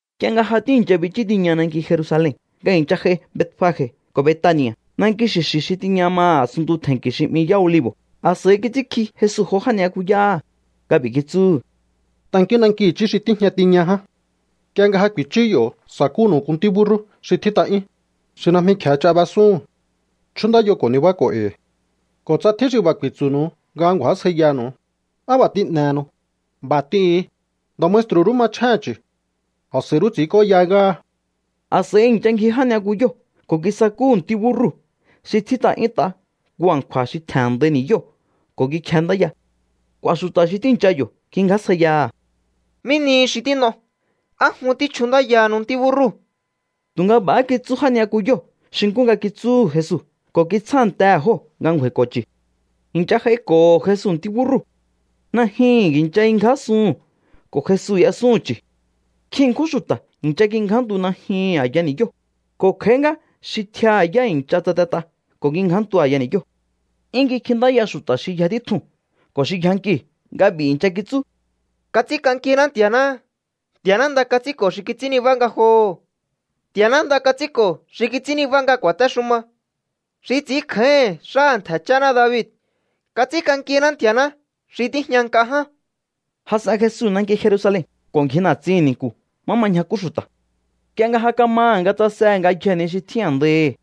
Nk'ie nga ja tíi̱ncha bichú tiña nanki Jerusalen nga i̱ncha j'ai Betfage ko̱ Betani̱a̱, nanki xi̱xi̱ xi tiña maha̱ a̱sunntu tje̱nki̱ xi 'mi Yá Olivo̱, a̱s'a̱i kits'ínkji Jesu jo já ni'yakuyáha̱ nga b'i̱ kitsúhu̱: —Tankíún nanki i̱chí xi tíjña tiña ján. Nk'ie nga ja ku̱i̱chú yo̱, sa̱kúnu̱u nku ntí búrrú xi tjít'a'yún, xi najmi kje̱e ch'a b'esúhu̱n. Chjúndáyo ko̱ nibáko̱o e̱i̱. Ko̱ tsa tjín xi b'a̱ ku̱i̱tsu̱nu̱u nga ngju̱ásjaiyanu̱u: “¿Á b'a̱ tín'ehenu?”, b'a̱ t'ihu̱un: “Nda̱ maestru̱ rú machjéhe̱n chu̱. A̱s'a̱i rú ts'i̱ínk'óya ngáha.” A̱s'a̱i i̱ncha ngji já ni'yakuyóo̱ ko̱ kisakúhu̱ ntí búrrú xi tjít'a'yúnt'a nku a̱nkju̱a̱ xi tje̱n a̱ndai ni̱yóo̱ ko̱ kikjendáya. K'u̱a̱ xu̱ta̱ xi tíi̱ncha yo̱ kingjásjaiyaha̱: —¿Mí nihi xi tín'o? ¿Á jun tíchjundáyahanu ntí búrrúu̱? Tu̱nga b'a̱há kitsú já ni'yakuyóo̱ xi nkú nga kitsúhu̱ Jesu ko̱ kitsjántehe̱ jóo̱ nga ngju̱a̱i̱ko̱ chu̱. I̱ncha j'aiko̱ho̱ Jesu ntí búrrúu̱. Najyuhu̱n i̱ncha kingjásuhu̱n ko̱ Jesu y'esúhu̱n chu̱. Nkjin ṉkjún xu̱ta̱ i̱ncha kingjántu najyuhu̱n a̱ya ni̱yóo̱, ko̱ kj'a̱í ngá xi tjiaha̱ yá i̱ncha tsatet'a ko̱ kingjántu a̱ya ni̱yóo̱. 'Yún kikjintáya xu̱ta̱ xi yja títjuu̱n ko̱ xi yjankiu̱ nga b'i̱ i̱ncha kitsú: —¡Kats'ínk'ankiná Nti̱a̱ná! ¡Nti̱a̱ná nda kats'ínko̱ xi kits'ín nibá ngajoho̱! ¡Nti̱a̱ná nda kats'ínko̱ xi kits'ín nibá nga ku̱a̱téxuma, xi ts'i̱ínkjáíhi̱n xáha̱ ntje̱ cháná David! ¡Kats'ínk'ankiná Nti̱a̱ná xi tíjña nk'a ján! Jas'en Jesu nanki Jerusalen ko̱ ngji na̱tsihi̱n ni̱nku̱ má ma ñjakú xu̱ta̱. Nk'ie nga ja kamaha̱ nga tsasehe̱ ngayjee̱ ni xi tjín a̱ndaihi̱,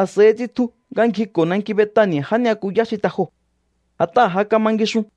a̱s'a̱i tsitju nga ngjiko̱ nanki Betani̱a̱ já ni'yakuyá xi te joo̱. A̱t'aha̱ ja kama ngixun.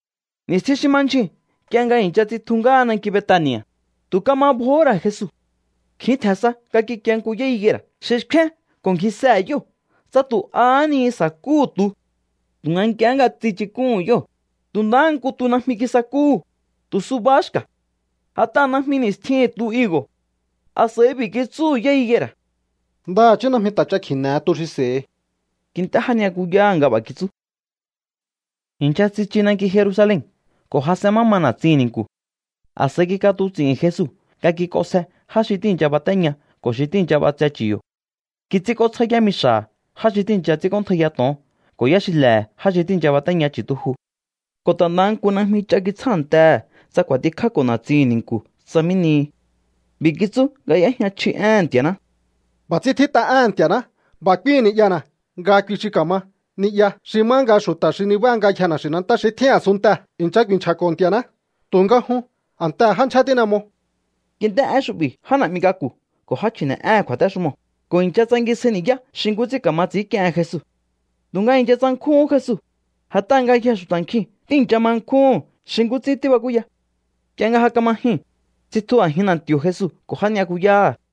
Ni̱stjin xi ma ndyjuu̱n nk'ie nga i̱ncha tsitju ngáha nanki Betani̱a̱, tu̱ kama bjohó ra̱ Jesu. Kjin tje̱n sa nga kikie nku yá higuera̱ xi xkfén ko̱ ngjisehe̱ yóo̱ tsa tu̱ ahá ni sa̱kúhu̱ tu. Tu̱nga nk'ie nga tsichuk'úhu̱n yóo̱, tu̱ ndahá nku tu najmi kisakúhu̱, tu̱ subahá xka̱. A̱t'aha̱ najmi ni̱stjihi̱n tu higo̱. A̱s'a̱i b'i̱ kitsúhu̱ yá higuera̱: —Ndaha̱chí najmi ta̱ ch'a kji̱ne̱he tu xi s'e̱hi. Kint'é já ni'yakuyáha̱ nga b'a̱ kitsú. I̱ncha tsichu nanki Jerusalen ko̱ jas'en má ma na̱tsihi̱n ni̱nku̱. A̱s'a̱i kik'atuts'i̱hi̱n Jesu nga kik'onsje já xi tíi̱ncha batéña ko̱ xi tíi̱ncha b'atse chu̱ yo̱. Kits'ínk'ótsjá yámixa̱ha̱ já xi tíi̱ncha ts'ínk'óntjaiya to̱on ko̱ yáxile̱he̱ já xi tíi̱ncha batéña chu̱tuju. Ko̱ ta̱ ndaha nku najmi ch'a kitsjántehe̱ tsa kj'u̱a̱tikjáko̱ na̱tsihi̱n ni̱nku̱ tsa mí nihi. B'i̱ kitsú nga y'éjña chji éhe̱n Nti̱a̱ná: —B'a̱ ts'ín tjít'a éhe̱n Nti̱a̱ná: “B'a̱ k'úíhi̱n ni'yana̱ nga kui xi ka̱ma ni'ya xi má nga xu̱ta̱ xi ni̱baha ngayjee̱ na̱xi̱nantá xi tjín a̱sunntee̱ i̱ncha ku̱i̱nchja̱ko̱ Nti̱a̱ná.” Tu̱nga jun a̱ntehe̱ já ndyjé tín'e mo. Kint'é én xu'bi̱ já na̱'mi k'aku̱ ko̱ já chji̱ne̱'éhe̱n kju̱a̱téxumoo̱ ko̱ i̱ncha tsangisjai ni̱yá xi nkú ts'ín ka̱ma ts'i̱ínk'iehen Jesu. Tu̱nga i̱ncha tsankjúhún Jesu, a̱t'aha̱ ngayjee̱ xu̱ta̱ nkjiu̱n tíi̱ncha ma nkjúhu̱n xi nkú ts'ín tíbakúya. Nk'ie nga ja kama jyuu̱n, tsitju a̱jin na̱nti̱o̱ Jesu ko̱ já ni'yakuyáha̱.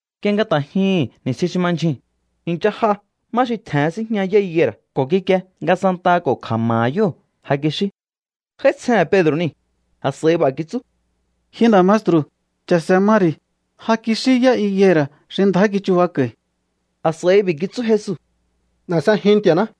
Nk'ie nga ta̱ jyuhu̱n ni̱stjin xi ma ndyjuu̱n, i̱ncha j'a má xi tje̱hen síjña yá higuera̱ ko̱ kikie nga santaha ko̱ kja̱ma̱ha̱ yóo̱ ja kixí. J'áítsjehe̱n Pedro̱ niu̱, a̱s'a̱i b'a̱ kitsú: —Ji nda̱ maestru̱, cha̱se̱ ma ri̱. Ja kixí yá higuera̱ xi ndjá kichubako̱i̱. A̱s'a̱i b'i̱ kitsú Jesu: —N'e̱ s'ejiun Nti̱a̱ná.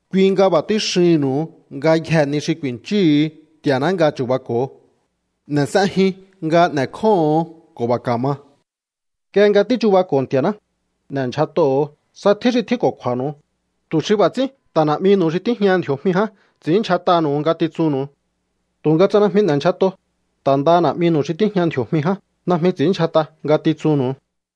Kui nga b'a̱ tíxihi̱nnu̱u. Ngayjee̱ ni xi ku̱i̱nchíhu̱u Nti̱a̱ná nga chu̱bako̱o, n'e̱ s'ejiun nga n'e̱kjóho̱on ko̱ b'a̱ ka̱ma. ’Nk'ie nga tíchubako̱o Nti̱a̱ná, n'e̱ndyjat'oho̱o tsa tjín xi tjínko̱kju̱a̱nu̱u, tu̱ xi b'a̱ ts'ín ta̱ Na̱'minu̱u xi tíjñaha ndji̱o̱jmi ján ts'i̱ínndyjat'aha̱nu̱u ngatitsunnu̱u. Tu̱nga tsa najmi n'e̱ndyjat'o, ta̱ ndaha Na̱'minu̱u xi tíjña ndji̱o̱jmi ján najmi ts'i̱ínndyjat'a ngatitsunnu̱u.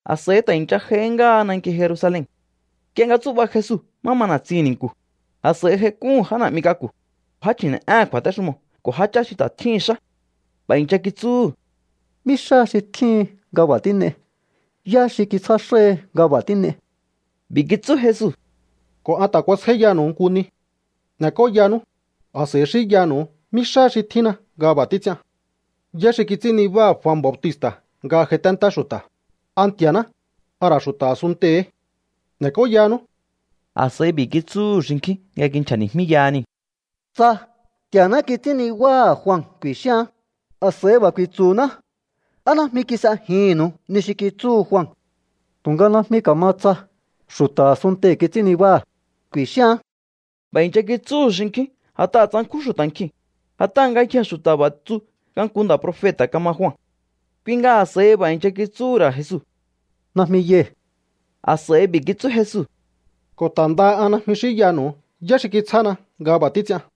A̱s'a̱i ta̱ i̱ncha j'ai ngáha nanki Jerusalen. Nk'ie nga tsú'ba Jesu má ma na̱tsihi̱n ni̱nku̱, a̱s'a̱i j'aik'úhu̱n já na̱'mi k'aku̱, já chji̱ne̱'éhe̱n kju̱a̱téxumoo̱ ko̱ jáchá xi ta̱ tjíhi̱n xá. B'a̱ i̱ncha kitsúhu̱: —¿Mí xá xi tjíhin nga b'a̱ tín'ei? ¿Yá xi kitsjá xáhi nga b'a̱ tín'ei? B'i̱ kitsú Jesu: —Ko̱ an ta̱ kuasjáíyanu̱u nku ni. N'e̱k'óyanú, a̱s'a̱i xínyanu̱u mí xáha xi tjínna nga b'a̱ títs'ian. ¿Yá xi kits'ín nibáha̱ Jua Bautista̱ nga j'aiténtá xu̱ta̱? ¿A Nti̱a̱ná, a ra̱ xu̱ta̱ a̱sunntei̱hí? N'e̱k'óyanú. A̱s'a̱i b'i̱ kitsúhu̱ xinkjín nga kinchja̱ni̱jmíyaha niu̱: —Tsa: “Nti̱a̱ná kits'ín nibáha̱ Jua”, ku̱i̱xíaán, a̱s'a̱i b'a̱ ku̱i̱tsu̱ná: “¿Á najmi kis'ejihi̱nnu̱u ni xi kitsúhu Jua?” Tu̱nga najmi ka̱ma tsa: “Xu̱ta̱ a̱sunntei̱ kits'ín nibáha̱”, ku̱i̱xíaán. B'a̱ i̱ncha kitsúhu̱ xinkjín a̱t'aha̱ tsankjún xu̱ta̱ nkjiu̱n, a̱t'aha̱ ngayjee̱ xu̱ta̱ b'a̱ tsu nga nku nda̱ profeta̱ kama Jua. Kui nga a̱s'a̱i b'a̱ i̱ncha kitsúhu̱ ra̱ Jesu: —Najmi yai̱. A̱s'a̱i b'i̱ kitsú Jesu: —Ko̱ ta̱ ndaha an najmi xínyanu̱u yá xi kitsjána nga b'a̱ títs'ian.